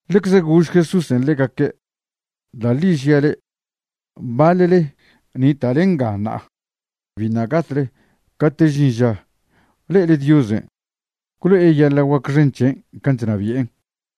Ḻecze gož Jesúsen' ḻegaque': ―Da' ḻi žia' le'e, baḻle nita'le nga ṉa'a biṉa' gatle cate' žin ža le'ele Diosen' gwlo'e yeḻa' guac xen c̱hen' can' chnabi'en'.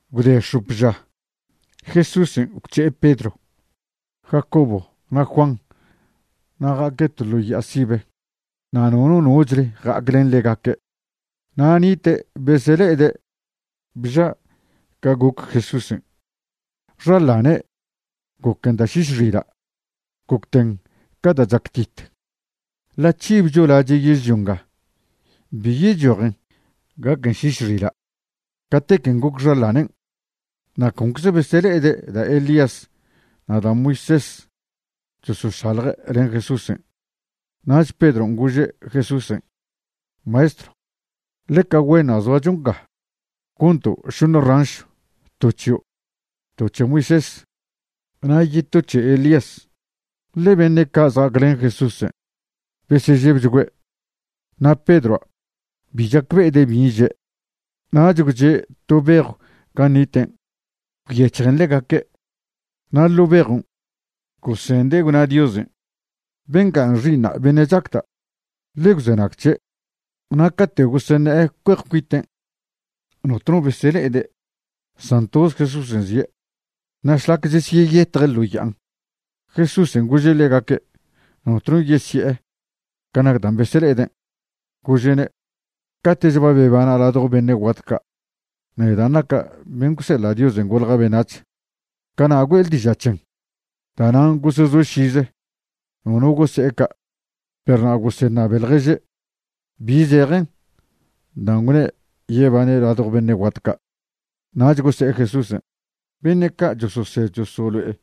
Gwde x̱op ža, Jesúsen' gwc̱he'e Pedro, Jacobo na' Juan na' ja'aque' to ḻo ya'a sibe, na' nono nochle ja'ac len ḻegaque'. Na' nite' besele'ede' bža' ca goc Jesúsen'. Xaḻane' goquen da' šiš xila', gocten ca da' chactite; ḻa' c̱hibcho lache' yežlio nga bi yechojen gaquen šiš xila' catequen' goc xaḻanen'. Na' concze besele'ede' da' Elías na' da' Moisés chosošalje' len Jesúsen'. Nach Pedron' gože' Jesúsen': ―Maestro, ¡ḻeca güenṉa' zoacho nga! Gonto' šoṉe ranšw, to c̱hio', to c̱he Moisés, na' yeto c̱he Elías. Ḻe beṉe' ca' zja'aclen Jesúsen' besežebchgüe', na' Pedroa' bi chacbe'ede' bin' že'. Nach gwche' to bejw gan' niten' gwyec̱hjen ḻegaque', na' ḻo' bejon' gosende' gwna Diosen': ―Bengan' Xi'iṉa' beṉe' chacda'; ḻe gwzenag c̱he'. Na' cate' goseṉe'e cue'ej cuiten' notno besele'ede', san toze Jesúsen' zie'. Na' šlac chesyeyetje' ḻo ya'an, Jesúsen' gože' ḻegaque' notno yesi'e ca nac dan' besele'eden'. Gože'ne': ―Cate'ch ba bebana' ladjo beṉe' guat ca', nedan' naca' ben' gwseḻa' Dios golja' beṉac̱h, cana' güe'le diža' c̱hen. Da'nan' gosezoe' šize, nono gose'e ca', perw na' goseṉabe ḻježe' bi zejen dan' gwne' yebane' ladjo beṉe' guat ca'. Nach gose'e Jesúsen': ―Beṉe' ca' chososed chosolo'e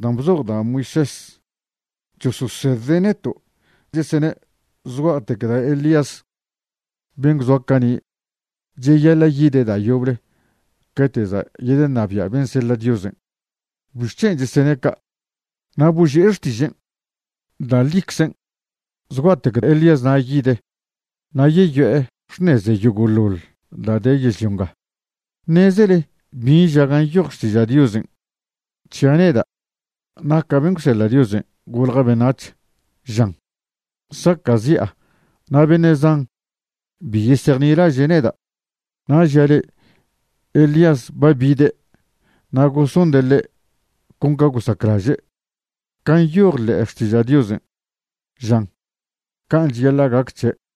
dan' bzoj da' Moisés chososedde' neto' chesene' zgua'tec da' Elías ben' gwzoa cani' cheyaḻa' yide' da' yoble cate' za' yedeṉabia' ben' seḻa' Diosen'. ¿Bixc̱hen' chesene' ca'? Na' boži'e xtižen': ―Da' ḻiczen' zgua'tec Elíasna' yide' na' yeyo'e xṉeze yogo'ḻoḻ da' de yežlio nga. ¿Ṉezele bin' ža gan' nyoj Xtiža' Diosen' c̱hia' neda' naca' ben' gwseḻa' Dios golja' beṉac̱h? Žan saca'zi'a na' beṉe' zan bi yesejnilaže' neda'. Na' žia' le'e, Elías ba bide' na' gosonde' ḻe' con ca gosaclaže', can' nyoj ḻe'e Xtiža' Diosen' žan can' cheyaḻa' gac c̱he'.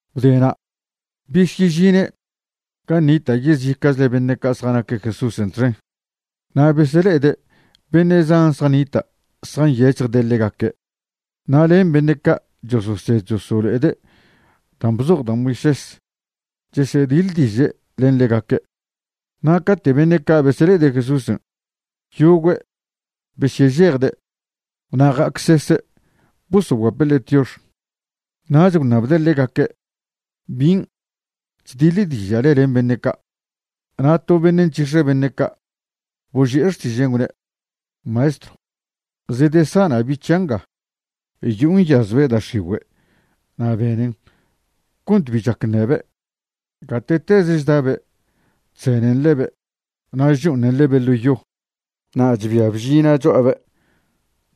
Gwdena' besyežine' gan' nita' yezica'chle beṉe' ca' zjanaque' Jesúsen' txen, na' besele'ede' beṉe' zan zjanita' zjanyec̱hjde' ḻegaque', na' len beṉe' ca' chososed chosolo'ede' dan' bzoj da' Moisés chesediḻdiže' len ḻegaque'. Na' cate' beṉe' ca' besele'ede' Jesúsen', yogüe' besyežejde' na' ja'acsese' bosoguape' ḻe' tiox. Nach gwṉabde' ḻegaque': ―¿Bin' chdiḻdiža'le len beṉe' ca'? Na' to beṉe' nc̱hix̱e beṉe' ca' boži'e xtižen', gwne': ―Maestro, zedesana' bi' c̱hia' nga, yo'o nyazbe' da' x̱igüe' na' benen cont bi chac ṉebe'. Gate'teze chdabe' chzenen ḻebe' na' chcho'oṉen ḻebe' ḻo yo, na' chbia bžina' cho'abe'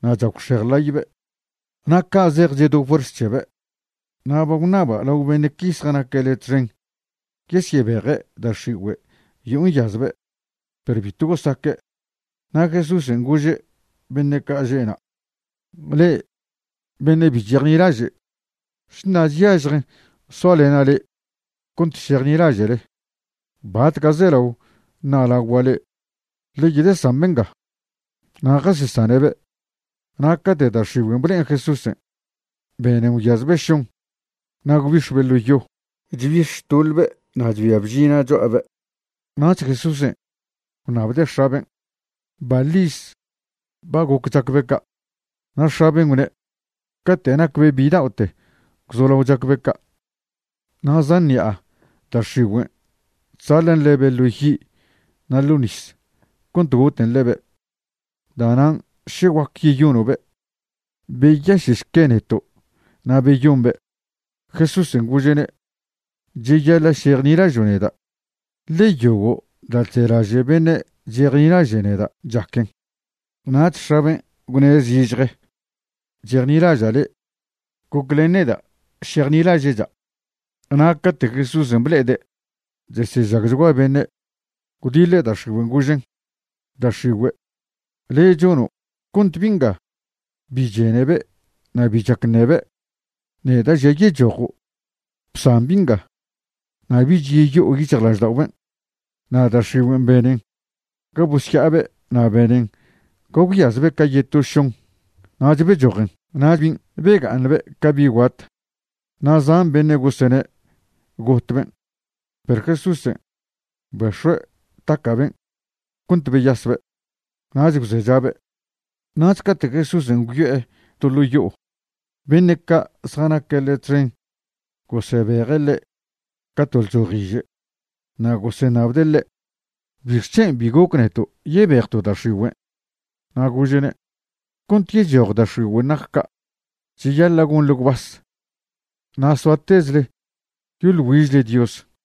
na' chagwxej ḻaybe'. Na' ca' zej chedo fuerz c̱hebe'. Na' ba gwṉaba' lao beṉe' qui zjanaque' le' txen yesyebeje' da' x̱igüe' yo'o nyazbe', perw bitw gosaque'. Na' Jesúsen' gože' beṉe' ca' že'na': ―¡Le'e beṉe' bi chejnilaže'! ¿Šna chyažjen soalena' le'e cont šejnilaže'le? ¿Batca' zelao ṉa'lagua' le'e? Ḻe yedesambe' nga. Na' jasesane'be', na' cate' da' x̱igüen' ble'en Jesúsen', benen gwyazbe' šon, na' gwbix̱be' ḻo yo, chbix̱ chtoḻbe' na' chbia bžina' cho'abe'. Nach Jesúsen' gwṉabde' x̱aben': ―¿Baḻ iz ba goc chacbe' ca'? Na' x̱aben' gwne': ―Cate' nacbe' bida'ote gwzolao chacbe' ca'. Na' zan ṉi'a da' x̱igüen' chzaḻan' ḻebe' ḻo yi' na' ḻo nis cont goten ḻebe'. Da'nan' še guac yeyono'be', beyaše'šque neto' na' beyombe'. Jesúsen' gože'ne': ―Cheyaḻa' šejnilažo' neda', ḻe yogo' da' chzelaže' beṉe' chesejnilaže' neda' chaquen. Nach x̱aben' gwne' zižje: ―¡Chejnilaža' le', goclen neda' šejnilaže'cha'! Na' cate' Jesúsen' ble'ede' chesežagchgua beṉe', gwdiḻe' da' x̱igüen' gožen': ―Da' x̱igüe', le' chono' cont bi' nga bi chenebe' na' bi chac ṉebe', neda' žia' yechojo'. Bsan bi' nga, na' bich yeyo'o yic̱hjlažda'oben'. Na' da' x̱igüen' benen ga bosya'abe' na' benen ga gwyazbe' ca yeto šon, nach bechojen. Na' bin' bega'aṉbe' ca bi' guat, na' zan beṉe' gosene' gotben'. Perw Jesúsen' bex̱ue' taca'ben' cont beyasbe', nach gwzechabe'. Nach cate' Jesúsen' gwyo'e to ḻo' yo'o, beṉe' ca' zjanaque' ḻe' txen gosebeje' ḻe' ca to lchojiže' na' goseṉabde' ḻe': ―¿Bixc̱hen' bi goc neto' yebejto' da' x̱igüen'? Na' gože'ne': ―Cont yechoj da' x̱igüen' nac ca' cheyaḻa' gonḻe gwbas na' soatezle yoḻ güižle Dios.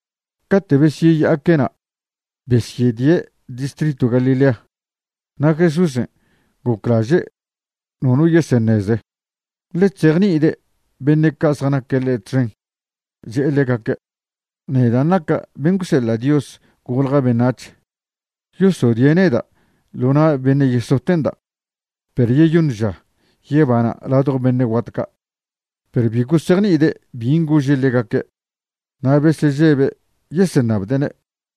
Cate' besyeya'aque' na', besyedie' distritw Galilea. Na' Jesúsen' goclaže' nono yeseṉeze, ḻe chzejni'ide' beṉe' ca' zjanaque' ḻe' txen, che'e ḻegaque': ―Nedan' naca' ben' gwseḻa' Dios golja' beṉac̱h, yosodie' neda' ḻo na' beṉe' yesote'nda', perw yeyoṉ ža yebana' ladjo beṉe' guat ca'. Perw bi gosejni'ide' bin' gože' ḻegaque', na' besežebe' yeseṉabde'ne'.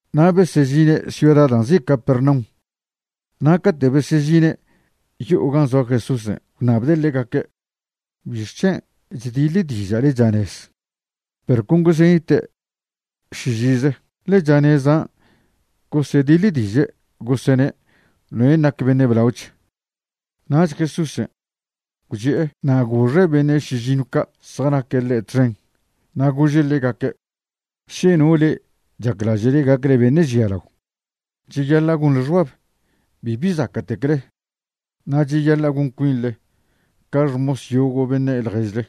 Na' besežine' ciuda da' nzi' Capernaum, na' cate' besežine' yo'o gan' zoa Jesúsen' gwṉabde' ḻegaque': ―¿Bixc̱hen' chdiḻdiža'le chanez? Perw con gosenite' šižize, ḻe chanezan' gosediḻdiže' gosene' noen' nac beṉe' blaoch. Nach Jesúsen' gwchi'e na' goxe' beṉe' šižiṉw ca' zjanaque' ḻe' txen, na' gože' ḻegaque': ―Še no le'e chaclaže'le gacle beṉe' žialao, cheyaḻa' gonḻe xbab bibi zaca'tecle, na' cheyaḻa' gon cuinḻe ca xmos yogo' beṉe' ḻježle.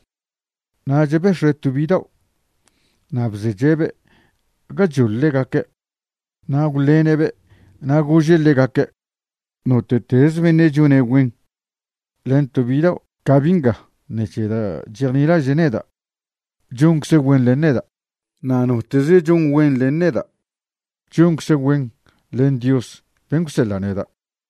Nach bex̱ue' to bidao' na' bzeche'be' gachoḻ ḻegaque', na' gwḻene'be' na' gože' ḻegaque': ―Note'teze beṉe' chone' güen len to bidao' ca bi' nga ṉec̱he da' chejnilaže' neda', choncze' güen len neda'; na' noteze' chon güen len neda', choncze' güen len Dios ben' gwseḻa' neda'.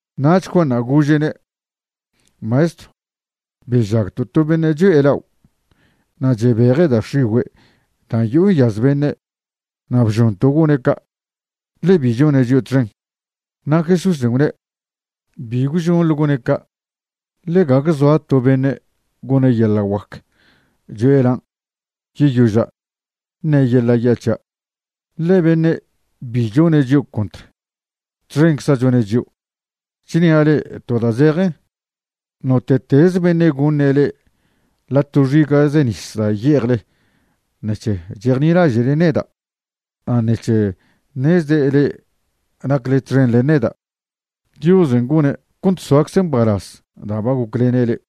Nach Juanṉa' gože'ne': ―Maestro, bežagto' to beṉe' cho'e lao' na' chebeje' da' x̱igüe' da' yo'o nyaz beṉe', na' bžonto' gone' ca', ḻe bi chone' chio' txen. Na' Jesúsen' gwne': ―Bi gwžonḻe gone' ca', ḻe gague zoa to beṉe' gone' yeḻa' guac cho'e lan', yeyoža' ṉe' yeḻa' ya' c̱hia'. Ḻe beṉe' bi chone' chio' contr, txencza' chone' chio'. Chnia' le'e to da' zejen, note'teze beṉe' goṉe' le'e ḻa' to xiga'ze nis da' ye'ejle ṉec̱he chejnilaže' neda' na' ṉec̱he ṉezde' le'e nacle txen len neda', Diosen' gone' cont soacze' mbalaz da' ba goclene' le'e.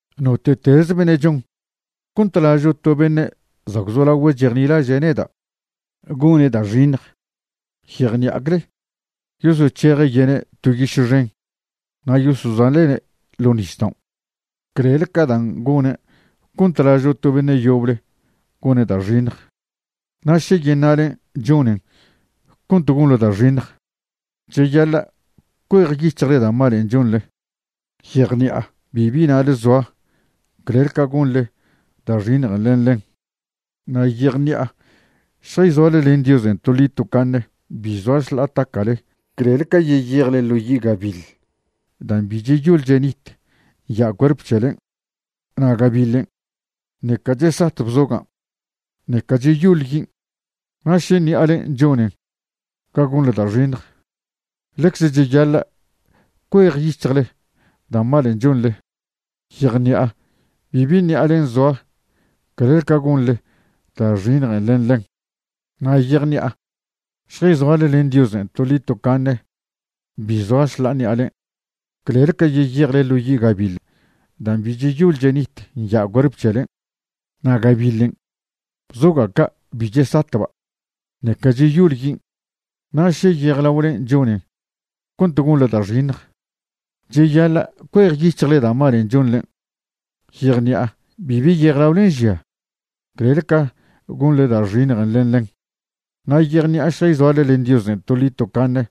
’Note'teze beṉe' chon cont lažo' to beṉe' za' gwzolagüe' chejnilaže' neda' gone' da' xiṉj, yejṉi'acle yosoc̱heje' yene' to yiše xen na' yosozaḻe'ne' ḻo' nisdaon' clel ca da' gone' cont lažo' beṉe' yoble gone' da' xiṉjen'. Na' še yeṉa'len' chonen cont gonḻe da' xiṉj, cheyaḻa' cuejyic̱hjle da' malen' chonḻe. Yejṉi'a bibi na'le zoa clel ca gonḻe da' xiṉjen' len ḻen. Na' yejṉi'a šjayzoale len Diosen' toḻi tocaṉe bi zoa šḻa'a taca'le clel ca yeyejle ḻo yi' gabiḻ dan' bi cheyol chenit nya' cuerp c̱helen'. Na' gabiḻen' ṉeca chesat bzogan', ṉeca cheyol yin'. Na' še ṉi'alen' chonen ga gonḻe da' xiṉj, ḻecze cheyaḻa' cuejyic̱hjle da' malen' chonḻe. Yejṉi'a bibi ṉi'alen' zoa clel ca gonḻe da' xiṉjen' len ḻen. Na' yejṉi'a šjayzoale len Diosen' toḻi tocaṉe bi zoa šḻa'a ṉi'alen', clel ca yeyejle ḻo' yi' gabiḻ dan' bi' cheyol chenit nya' cuerp c̱helen'. Na' gabiḻen' bzoga' ca' bi chesatba', ṉeca cheyol yin'. Na' še yejlaolen' chonen cont gonḻe da' xiṉj, cheyaḻa' cuejyic̱hle da' malen' chonḻen'. Yejṉi'a bibi yejlaolen' žia clel ca gonḻe da' xiṉjen' len ḻen. Na' yejṉi'a šjayzoale len Diosen' toḻi tocaṉe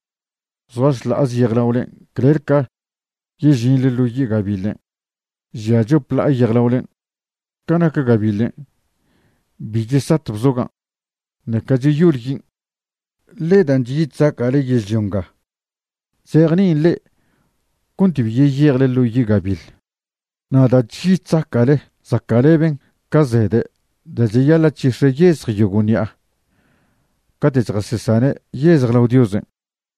zoa šḻa'aze yejlaole clel ca yežinḻe ḻo yi' gabiḻen' žia chop ḻa'a yejlaolen'. Ca nac gabiḻen', bi chesat bzogan', ṉeca cheyol yin'. ’Ḻe dan' chyi chzaca'le yežlio nga chzejni'in le'e cont bi yeyejle ḻo yi' gabiḻ. Na' da' chyi chzaca'le zaca'leben ca zede' da' cheyaḻa' c̱hix̱e' yezj yogo' ṉi'a cate' chjasesane' yezj lao Diosen'.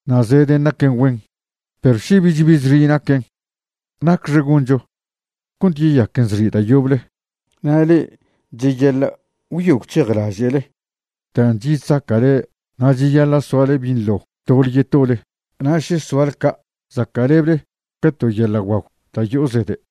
Na' zeden' naquen güen, perw še bich bi zxi' naquen, ¿nacxe goncho cont yeyaquen zxi' da' yoble? Na' le'e cheyaḻa' gwyo gwc̱hejlaže'le dan' chyi chzaca'le na' cheyaḻa' soale binḻo tole yetole, na' še soale ca', zaca'leble ca to yeḻa' guagw da' yo'o zede'.